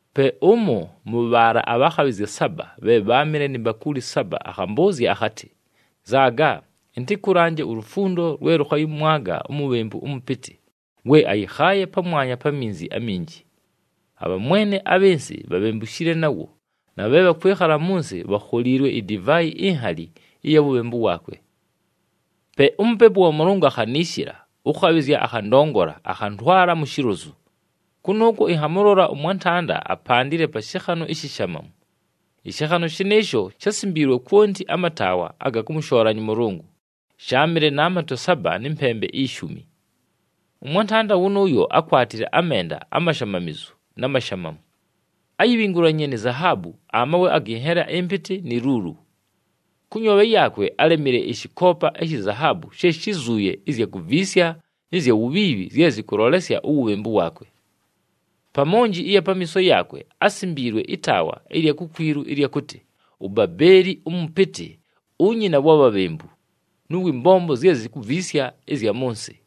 Pe ʉmo mʉ bhaala abhakhabhɨzya saba bhe bháamɨle ni mbakuuli saba akhambʉʉzya akhatɨ, “Nzaaga, ɨntɨkʉlanje ulufundo lwe lʉkhayɨmwaga umubhembu ʉmʉpɨtɨ, we ayɨkhaaye pamwanya pa minzi aminji. Abhamwene abhɨ nsɨ bhabhembushile nawo na bhe bhakwɨkhala mʉ nsɨ bhakholiilwe idivaayi inhali ɨya wubhembu waakwe.” Pe uMupepu wa Mʉlʉngʉ akhaniishila, ʉkhabhɨzya akhandongola, akhantwala mu shilozu. Kʉnʉʉkwo ɨnhamʉlola ʉmwantanda apandile pa shɨkhanʉ ishishamamu. Ɨshɨkhanʉ shɨnɨɨsho shásimbiilwe kwonti amataawa aga kʉmʉshoolanya ʉMʉlʉngʉ, sháamɨle na matwe saba nɨ mpembe ishumi. Ʉmwantanda wʉnʉʉyo ákwatile amenda amashamamizu na mashamamu. Áyibhingulanyiinye ni zahaabu, amawe agɨ nhela ɨmpɨtɨ ni luulu. Kʉ nyoobhe yaakwe álemile ɨshɨkoopa ishi zahaabu she shizuuye ɨzya kuviisya nɨ zya wubhiibhi zye zɨkʉlolesya uwubhembu waakwe. Pa monji ɨya pamiiso yaakwe asimbiilwe ɨtaawa ɨlya kukwilu ɨlya kʉtɨ, “UBABEELI ɄMɄPƗTƗ, UNYINA WA BHABHEMBU NɄ WƗ MBOMBO ZYE ZIKUVIISYA ƗZYA MɄ NSƗ.”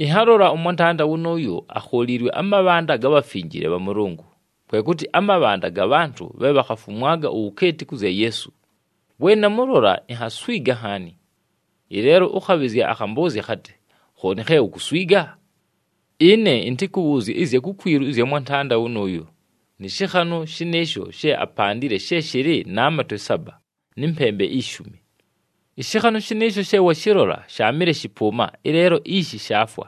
Ɨnhalola ʉmwantanda wʉnʉʉyo akholiilwe amabhanda ga bhafinjile bha Mʉlʉngʉ, kwe kʉtɨ amabhanda ga bhantʉ bhe bhakhafumwaga uwukeeti kʉ zya Yeesu. We namʉlola, inhaswiga nhaani. Ɨleelo ʉkhabhɨzya akhambʉʉzya akhatɨ, “Khooni khe ukuswiga? Ɨne ɨntɨkʉbhʉʉzye ɨzya kukwilu ɨzya mwantanda wʉnʉʉyo nɨ shɨkhanʉ shɨnɨɨsho she apandile she shɨlɨ na matwe saba nɨ mpembe ishumi. Ɨshɨkhanʉ shɨnɨɨsho she washɨlola shaamɨle shɨpʉʉma ɨleelo ishi shaafwa.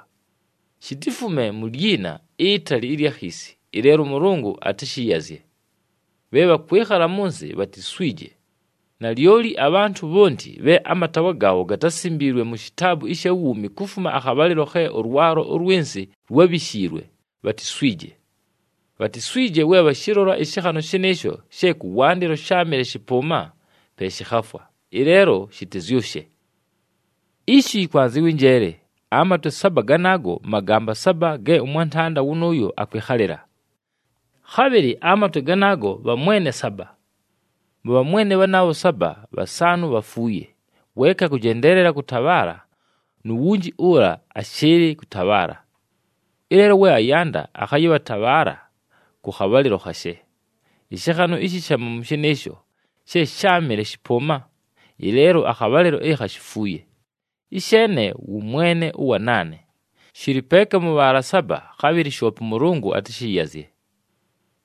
Shitifume mu lyina itali ɨlya khiisi, ɨleelo ʉMʉlʉngʉ atɨshɨyazye. Bhe bhakwɨkhala mʉ nsɨ bhatiswije. Nalyoli abhantʉ bhonti bhe amataawa gaabho gatásimbiilwe mu shitaabu ɨsha wuumi kufuma akhabhalɨlo khe ʉlwalo ʉlwɨ nsɨ lwábhishiilwe, bhatiswije. Bhatiswije we bhashɨlola ɨshɨkhanʉ shɨnɨɨsho she kʉwandɨlo sháamɨle shɨpʉʉma, pe shɨkhafwa, ɨleelo shɨtɨzyʉshe! “Ishi yɨkwanzɨwa ɨnjeele! Amatwe saba ganaago, magamba saba ge ʉmwantanda wʉnʉʉyo akwɨkhalɨla. Khabhɨlɨ, amatwe ganaago bhamwene saba. Mʉ bhamwene bhanaabho saba, bhasaanʉ bhafuuye, weeka akʉjendeelela kʉtabhaala nu wunji ʉla ashɨɨlɨ kʉtabhaala. Ɨleelo we ayanda akhayɨtabhaala kʉ khabhalɨlo khashe. Ɨshɨkhanʉ ishishamamu shɨnɨɨsho she sháamɨle shɨpʉʉma, ɨleelo akhabhalɨlo ɨkha shifuuye, ɨsheene wʉ mwene ʉwa naane, shɨlɨ peeka mʉ bhaala saba, khabhɨlɨ shoope ʉMʉlʉngʉ atɨshɨyazye.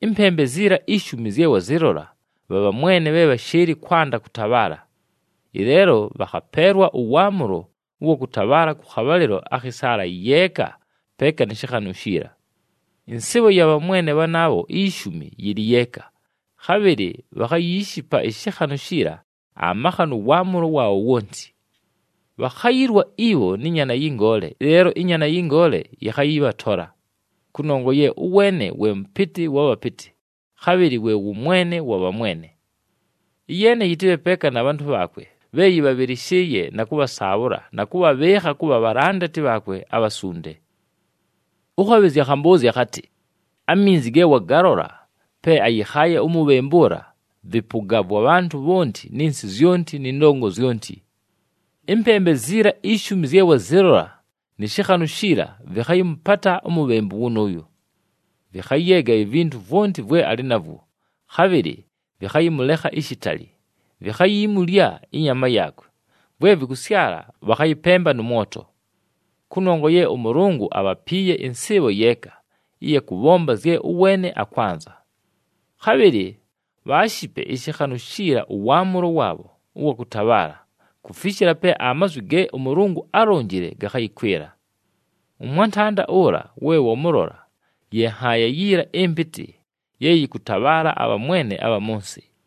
Ɨmpembe ziila ishumi zye wazɨlola, bha bhamwene bhe bhashɨɨlɨ kwanda kʉtabhaala. Ɨleelo bhakhapeelwa ʉwaamʉlo ʉwa kʉtabhaala kʉ khabhalɨlo akhɨ saala yeeka peeka nɨ shɨkhanʉ shiila. Ɨnsɨɨbho ya bhamwene bhanaabho ishumi yɨlɨ yeeka, khabhɨlɨ bhakhayiishipa ɨshɨkhanʉ shiila amakha nʉ waamʉlo waabho wonti. Bhakhayilwa ibho nɨ Nyaana yɨ Ngoole, ɨleelo ɨNyaana yɨ Ngoole yɨkhayɨbhatola, kʉnongwa ye ʉweene we Mʉpɨtɨ wa bhapɨtɨ, khabhɨlɨ we wʉ Mwene wa bhamwene. Ɨyeene yɨtɨbhe peeka na bhantʉ bhaakwe bhe yɨbhabhɨlɨshɨɨye na kʉbhasaabhʉla na kʉbhabhɨɨkha kʉbha bhalandati bhaakwe abhasunde.” Ʉkhabhɨzya akhambʉʉzya akhatɨ, “Aminzi ge wagalola pe ayɨkhaaye umubhembu ʉla, vɨpʉga vwa bhantʉ bhonti nɨ nsɨ zyonti nɨ ndongo zyonti. Ɨmpembe ziila ishumi zye wazɨlola nɨ shɨkhanʉ shiila vɨkhayɨmʉpata umubhembu wʉnʉʉyo. Vɨkhayeega ivintu vwonti vwe alɨ navwo, khabhɨlɨ vɨkhayɨmʉlekha ishitali, vikhayimulya ɨnyama yaakwe, vwe vɨkʉsyala bhakhayɨpemba nʉ mwoto. Kʉnongwa ye ʉMʉlʉngʉ abhapiiye ɨnsɨɨbho yeeka, ɨya kʉbhomba zye ʉweene akwanza. Khabhɨlɨ bhaashipe ɨshɨkhanʉ shiila ʉwaamʉlo waabho ʉwa kʉtabhaala, kufishila pe amazwi ge ʉMʉlʉngʉ álonjile gakhayɨkwɨla. Ʉmwantanda ʉla we wamʉlola, ye nhaaya yiila ɨmpɨtɨ ye yɨkʉtabhaala abhamwene abha mʉ nsɨ.”